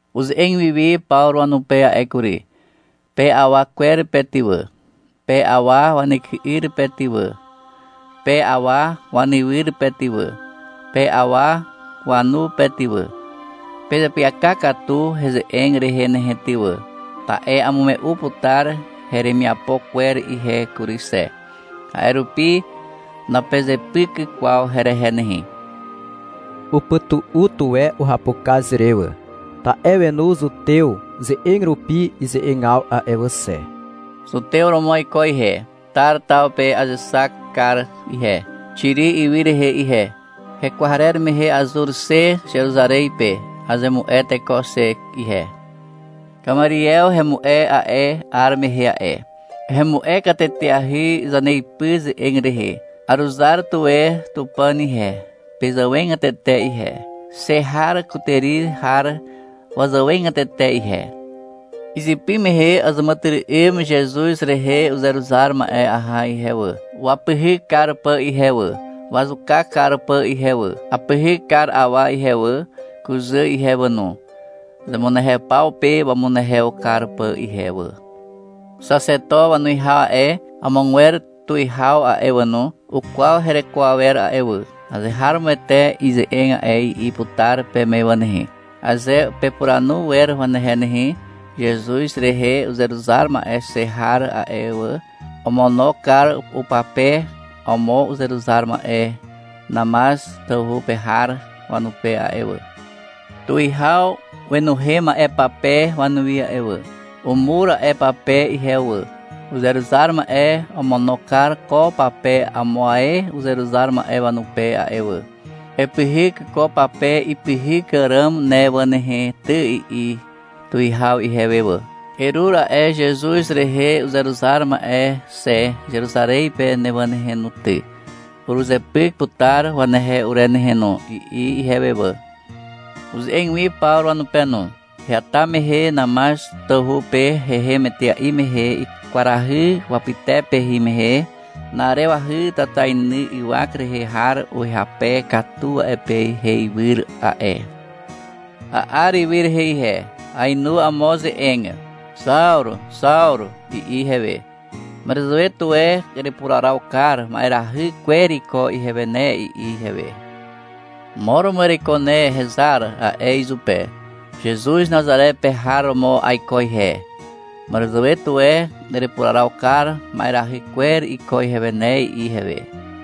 (Uze'eg wiwi Pawru wanupe a'e kury.) — Pe awa kwer pe ty wà, pe awa wanyky'yr pe ty wà, pe awa wanywyr pe ty wà, pe awa wanu pe ty wà. Pezeapyaka katu heze'eg rehe nehe ty wà, ta'e amume'u putar heremiapo kwer ihe kury xe. A'e rupi napezepyk kwaw herehe nehe. Upytu'u tuwe uhapukaz re wà, ta'e wenu zutew ze'eg rupi ize'egaw a'e wà xe. Zutew romo aiko ihe. Tar taw pe azexak kar ihe, Xiri ywy rehe ihe. Hekwarer mehe azur xe Zeruzarez pe. Azemu'e teko xe ihe. Kamariew hemu'e a'e 'ar mehe a'e. Hemu'e kateteahy zaneipy ze'eg rehe. Aruzar tuwe Tupàn ihe, pezàwegatete ihe, xe har kutàri har wazàwegatete ihe. Izypy mehe azàmàtyry'ym Zezuz rehe uzeruzar ma'e aha ihe wà, wapyhyk kar pà ihe wà, wazuka kar pà ihe wà. Apyhyk kar awa ihe wà, kuzà ihe wà no, zemunehew paw pe wamunehew kar pà ihe wà. Xaxeto wanuwihaw a'e, amogwer tuwihaw a'e wà no, ukwaw hereko awer a'e wà. — Azeharomoete ize'eg a'e, i'i putar peme wà nehe, aze pepuranu wer wanehe nehe. Zezuz rehe uzeruzar ma'e xe har a'e wà, omono kar upape amo uzeruzar ma'e Namaz tawhu pe har wanupe a'e wà. Tuwihaw wenuhem a'e pape wanuwi a'e wà. Umur a'e pape ihewe wà. — Uzeruzar ma'e omono kar ko pape amo ae uzeruzar ma'e wanupe a'e wà. Epyhyk ko pape ipyhyk àràm ne wà nehe ty, i'i tuwihaw ihewe wà. — Erur a'e Zezuz rehe uzeruzar ma'e xe Zeruzarez pe ne wà nehe no ty. Uruzepyk putar wanehe ure nehe no, i'i ihewe wà. Uze'eg wi Pawru wanupe no. — Heata mehe Namaz tawhu pe hehem etea'i mehe kwarahy wapytepe hin mehe na'arewahy tatainy ywak rehe har uhyape katu a'e pe heiwyr a'e. A'ar ywy rehe ihe. Aenu amo ze'eg. — Xawru, Xawru, i'i ihewe. — Màràzàwe tuwe erepuraraw kar ma'erahy kwer iko ihewe ne, i'i ihewe. — Mo romo ereiko ne, hezar, a'e izupe. — Zezuz Nazare pe har romo aiko ihe. Màràzàwe tuwe erepuraraw kar ma'erahy kwer iko ihewe ne, i'i ihewe.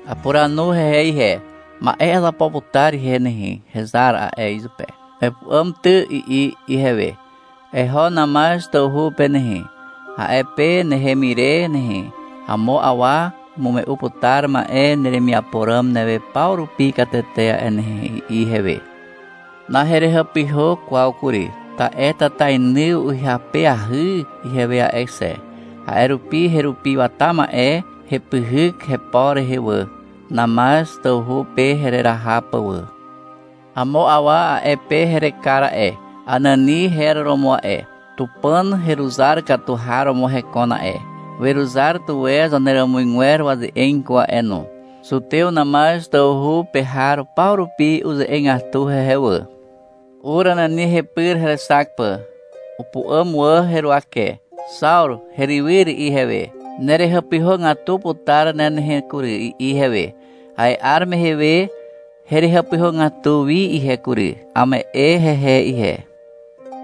Apuranu hehe ihe. — Ma'e azapo putar ihe nehe, hezar, a'e izupe. — Epu'àm ty, i'i ihewe. — Eho Namaz tawhu pe nehe. A'e pe nehem ire nehe, amo awa umume'u putar ma'e neremiapo ràm newe paw rupi katete a'e nehe, i'i ihewe. Naherehàpyhà kwaw kury, ta'e tatainy uhyapeahy ihewe a'e xe. A'e rupi herupi wata ma'e hepyhyk hepo rehe wà, Namaz tawhu pe hereraha pà wà. Amo awa a'e pe herekar a'e. Anani her romo a'e. Tupàn heruzar katu har romo hekon a'e. Weruzar tuwe zaneràmuzgwer waze'eg iko a'e no. Zutew Namaz tawhu pe har paw rupi uze'egatu hehe wà. Ur Anani hepyr herexak pà. Upu'àm wà heruwake. — Xawru herywyr, i'i ihewe. — Nerehàpyhàgatu putar ne nehe kury, i'i ihewe. A'e 'ar mehe we herehàpyhàgatu wi ihe kury. Ame'e hehe ihe.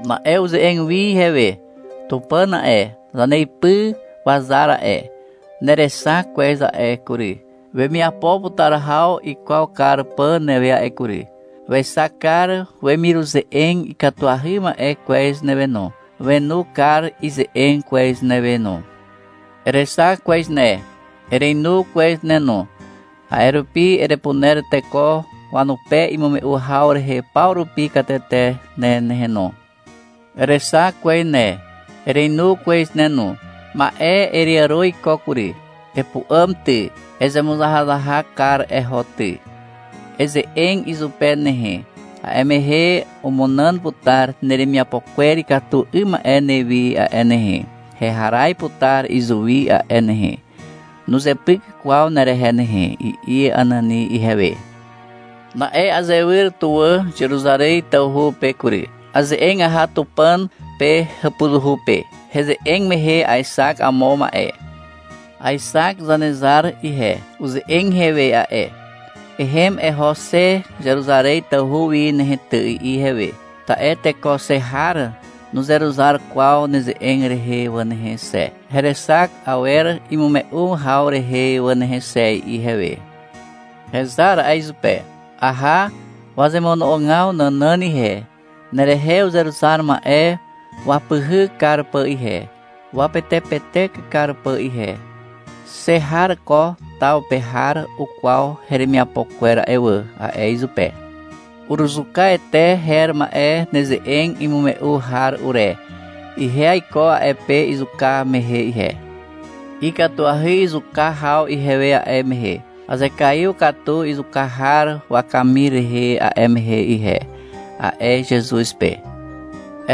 Na'e uze'eg wi ihewe. — Tupàn a'e, zaneipy wazar a'e, nerexak kwez a'e kury, wemiapo putar haw ikwaw kar pà newe a'e kury. Wexak kar wemiruze'eg ikatuahy ma'e kwez newe no. Wenu kar ize'eg kwez newe no. Erexak kwez ne, erenu kwez ne no. A'e rupi erepuner teko wanupe imume'u haw rehe paw rupi katete ne nehe no. Erexak kwez ne, erenu kwez ne no. Ma'e ereàro iko kury. Epu'àm ty, ezemuzahazahak kar eho ty. Eze'eg izupe nehe, a'e mehe umunàn putar neremiapo kwer ikatu 'ym ma'e newi a'e nehe, heharaz putar izuwi a'e nehe. Nuzepyk kwaw nerehe nehe, i'i Anani ihewe. — Na'e azewyr tuwà Zeruzarez tawhu pe kury. Aze'eg aha Tupàn pe hàpuzuhu pe. Heze'eg mehe aexak amo ma'e. Aexak Zanezar ihe. Uze'eg ihewe a'e. — Ehem eho xe Zeruzarez tawhu wi nehe ty, i'i ihewe. — Ta'e teko xe har nuzeruzar kwaw neze'eg rehe wà nehe xe, herexak awer imume'u haw rehe wà nehe xe, i'i ihewe. — Hezar, a'e izupe. — Aha wazemono'ogaw nànàn ihe, nerehe uzeruzar ma'e wapyhyk kar pà ihe, wapetepetek kar pà ihe. Xe har ko taw pe har ukwaw heremiapo kwer a'e wà, a'e izupe. — Uruzuka Ete her ma'e neze'eg imume'u har ure. Ihe aiko a'e pe izuka mehe ihe. Ikatuahy izuka haw ihewe a'e mehe. Azekaiw katu izuka har wakamir rehe a'e mehe ihe, a'e Zezuz pe.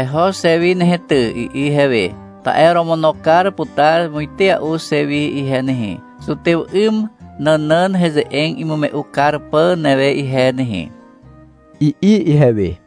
— Eho xe wi nehe ty, i'i ihewe. — Ta'e oromono kar putar muitea'u xe wi ihe nehe, zutew 'ym nànàn heze'eg imume'u kar pà newe ihe nehe, i'i ihewe.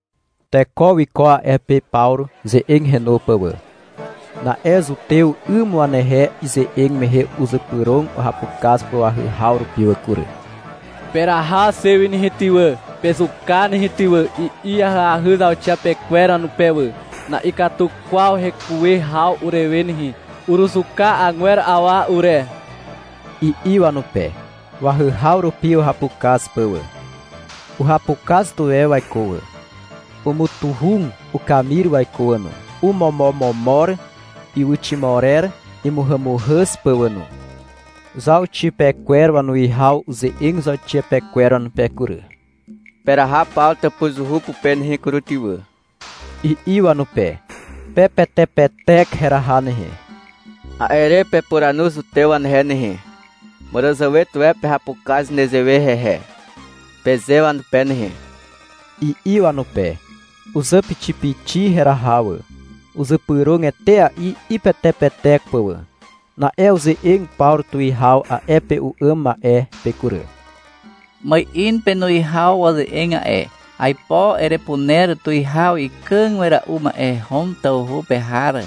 Teko wiko a'e pe Pawru ze'eg henu pà wà. Na'e zutew 'ym wanehe ize'eg mehe uzypyrog uhapukaz pà wahyhaw rupi wà kury. — Peraha xe wi nehe ty wà, pezuka nehe ty wà, i'i ahyahy zauxiapekwer wanupe wà. — Na'ikatu kwaw hekuwe haw urewe nehe. Uruzuka agwer awa ure, i'i wanupe, wahyhaw rupi uhapukaz pà wà. Uhapukaz tuwe waiko wà. Umutuhug ukamir waiko wà no. Omomomomor ywyximorer imuhàmuhàz pà wà no. Zauxiapekwer wanuwihaw uze'eg zauxiapekwer wanupe kury. — Peraha Pawru tàpuzuhu pupe nehe kury ty wà, i'i wanupe. — Pepetepetek heraha nehe. A'e re pepuranu zutew wanehe nehe. — Màràzàwe tuwe pehapukaz nezewe hehe, peze wanupe nehe, i'i wanupe. Uzàpixipixi heraha wà. Uzypyrog etea'i ipetepetek pà wà. Na'e uze'eg Pawru tuwihaw a'e pe u'àm ma'e pe kury. — Ma'in penuwihaw waze'eg a'e. Aipo erepuner tuwihaw ikàg wera'u ma'e Hom tawhu pe har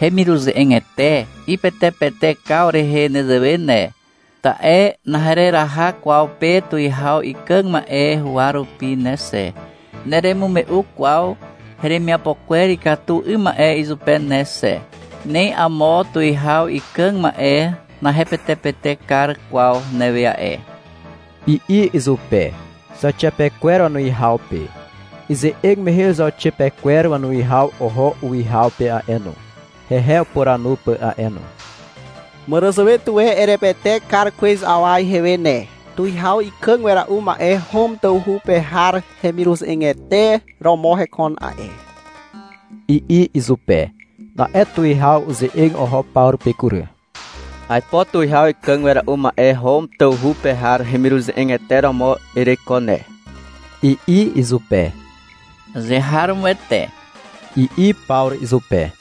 hemiruze'egete ipetepetekaw rehe nezewe ne. Ta'e nahereraha kwaw pe tuwihaw ikàg ma'e huwa rupi ne xe, neremume'u kwaw heremiapo kwer ikatu 'ym ma'e izupe ne xe. Ni amo tuwihaw ikàg ma'e nahepetepetek kar kwaw newe a'e, i'i izupe, zauxiapekwer wanuwihaw pe. Ize'eg mehe zauxiapekwer wanuwihaw oho uwihaw pe a'e no, hehe upuranu pà a'e no. — Màràzàwe tuwe erepetek kar kwez awa ihewe ne. Tuwihaw ikàg wera'u ma'e Hom tawhu pe har hemiruze'egete romo hekon a'e, i'i izupe. Na'e tuwihaw uze'eg oho Pawru pe kury. — Aipo tuwihaw ikàg wera'u ma'e Hom tawhu pe har hemiruze'egete romo ereiko ne, i'i izupe. -Azeharomoete, i'i Pawru izupe.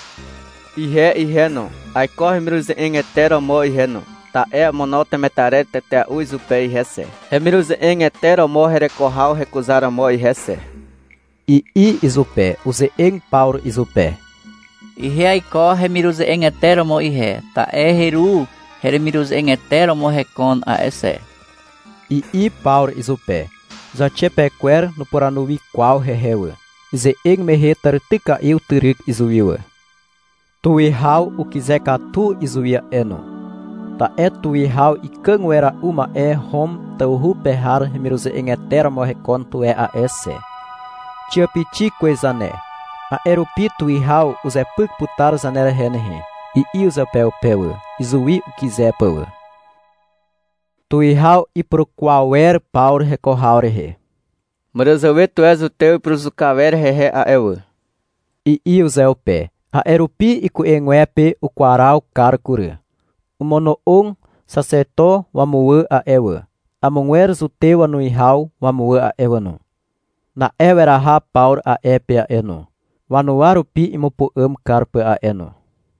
— Ihe ihe no, aiko hemiruze'egete romo ihe no, ta'e amono temetarer tetea'u izupe ihe xe, hemiruze'egete romo hereko haw hekuzaromo ihe xe, i'i izupe. Uze'eg Pawru izupe. — Ihe aiko hemiruze'egete romo ihe, ta'e heru hemiruze'egete romo hekon a'e xe, i'i Pawru izupe. Zauxiapekwer nupuranu wi kwaw hehe wà. Ize'eg mehe tàrityka'i utyryk izuwi wà. Tuwihaw ukyze katu izuwi a'e no, ta'e tuwihaw ikàg wera'u ma'e Hom tawhu pe har hemiruze'egete romo hekon tuwe a'e xe. — Xiàpixi kwez zane. A'e rupi tuwihaw uzepyk putar zanerehe nehe, i'i uzeupeupe wà, izuwi ukyze pà wà. Tuwihaw ipurukwaw wer Pawru heko haw rehe. — Màràzàwe tuwe zutew ipuruzuka wer hehe a'e wà, i'i uzeupe. A'e rupi iku'egwepe ukwaraw kar kury. Omono'og Xaxeto wamuwà a'e wà, amogwer zutew wanuwihaw wamuwà a'e wà no. Na'e weraha Pawru a'e pe a'e no, wanuwa rupi imupu'àm kar pà a'e no.